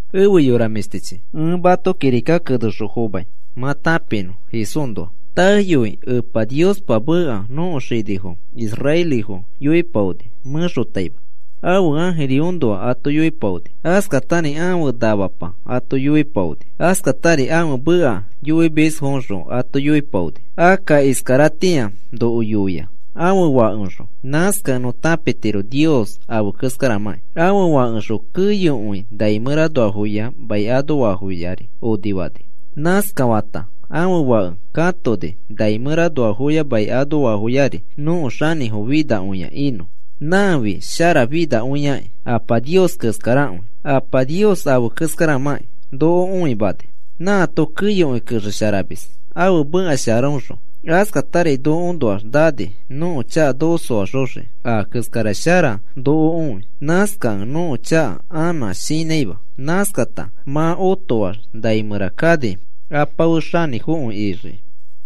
Efe yora mĩshtichi, ẽ mato kirika kenexõ fomai mã tãpinõ Jesúsnoa. Taeyoi Epa Niospa ãfe meka nõko xinifo israelifo yoipaoni mẽxotaima. Ãfe ãjiriõnoa ato yoipaoni. Askatari ãfe namapa ato yoipaoni. Askatari ãfe meka yoimisfoxõ ato yoipaoni. Akka iskaratĩa noko yoia ãfe Fakeoxõ. Nãskakẽ nõ tãpitiro Nios afe keskaramãki. Ãfe Fakeoxõ keyokõi nai mẽranoafoya mai anoafoyari onifani. Nãskafata ãfe Fake katoni nai mẽranoafoya mai anoafoyari nõko xanĩfo finakõia inõ. Nãfi sharafinakõiaki Apa Nios keskarakõi. Apa Nios afe keskaramãki noko õimani. Nãato keyokõi kexesharamis ãfe mekasharaõxõ. Askatari nokoõnoax nani nõko chaka noko soaxoxiki a keskara shara noko õi. Nãskakẽ nõko chaka anã shinãima. Nãskata mã otoax nai mẽra kani Apa fe xanĩfokõi ixiki.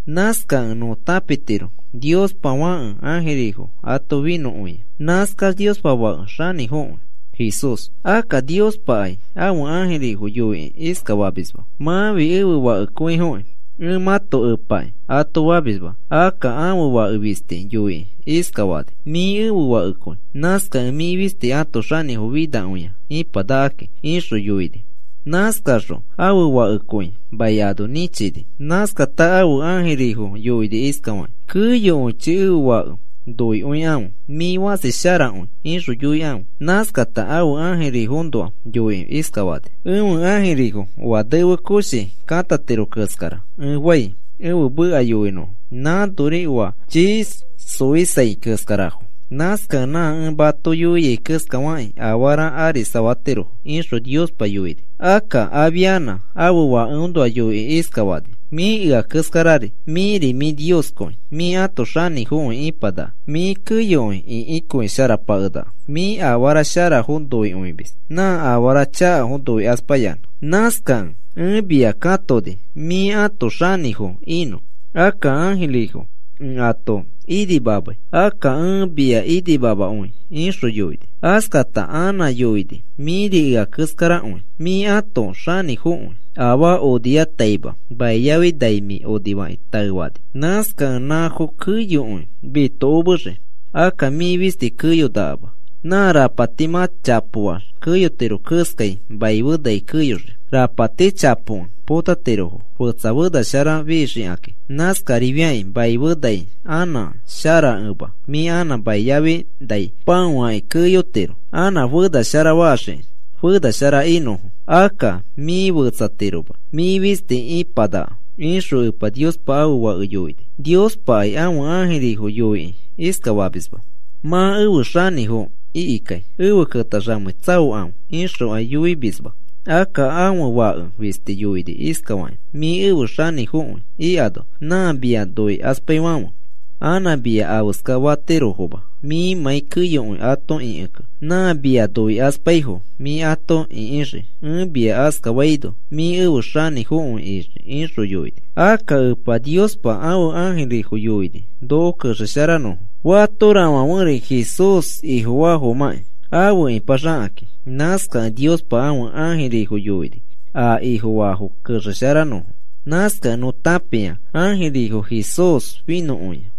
Nãskakẽ nõ tãpitiro Niospa Fãke ãjirifo ato finõkõia. Nãskax Niospa Fake xanĩfokõi Jesús. Akka Niospakai ãfe ãjirifo yoikĩ iskafamisma: Mãfi ẽfe Fakekõifokĩ. Ẽ mãto Epaki, ato famisma. Akka ãfe Fake fisti yoikĩ iskafani: Mĩ ẽfe Fakekõi. Nãskakẽ mĩ fisti ãto xanĩfo finakõia ipanakaki, ixõ yoini. Nãskaxõ ãfe Fakekõi mai ano nĩchini. Nãskata ãfe ãjirifo yoini iskafakĩ: Keyokõichi ẽfe Fake noikõikãfe. “Mĩ fãsi sharakõi,” ixõ yoikãfe. Nãskata ãfe ãjirifoõnoa yoikĩ iskafani: Ẽfe ãjirifo oa nefe koshi katiro keskara ẽ fai, ẽfe meka yoinõfo. Nãfori oa chii xoisai keskarafo. Nãskakẽ nã ẽ ato yoiai keskafakĩ afara arisafatirofo, ixõ Niospa yoini. Akka afianã ãfe Fakeõnoa yoikĩ iskafani: Mĩ ea keskarari. Mĩri mĩ Nioskõi. Mĩ ãto xanĩfokõi ipanaka. Mĩ keyokõi ĩkikõisharapakenaka. Mĩ afara sharafo noikõimis, nã afara chakafo noikaspayanã. Nãskakẽ ẽ mia katoni mĩ ãto xanĩfo inõ. Akka ãjirifo ẽ ato inimamai. Akka ẽ mia inimamakõi, ixõ yoini. Askata anã yoini, Mĩri ea keskarakõi. Mĩ ãto xanĩfokõi. Afaa oniyamatai mai yafi nai mĩ onifakĩ taefani. Nãskakẽ nãfo keyokõi mitokomexii. Akka mĩ fisti keyonakama. Nã rapati mã chapoax keyotiro keskai mai fe nai keyoxii. Rapati chapokẽ potatirofo fetsa fena shara fixikakĩ. Nãskarifiakĩ mai fe nai anã sharakẽma mĩ anã mai yafi nai pãofakĩ keyotiro. Anã fenashara faxiki fenashara inõfo. Akka mĩ fetsatiroma. Mĩ fisti ipanaka, ixõ Epa Niospa ãfe Fake yoini. Niospakai ãfe ãjirifo yoikĩ iskafamisma: Mã efe xanĩfo ikikai efe ketaxamei. Tsaokãfe, ixokai yoimisma. Akka ãfe Fake fisti yoini iskafakĩ: Mĩ efe xanĩfokõi ikano nã mia noikaspaifãfe anã mia afeska fatirofoma mĩmãi keyokõi ato ĩkikẽ. Nã mia noikaspaifo mĩ ato ikĩxii, ẽ mia askafaino mĩ efe xanĩfokõi ixii, ixõ yoini. Akka Epa Niospa ãfe ãjirifo yoini noko kexesharanõfo. Fatorafãferi Jesús Ifofaafomãkĩ afe ipaxakakĩ. Nãskakẽ Niospa ãfe ãjirifo yoini a Ifofaafo kexesharanõfo. Nãskakẽ nõ tãpia ãjirifo Jesús finõkõia.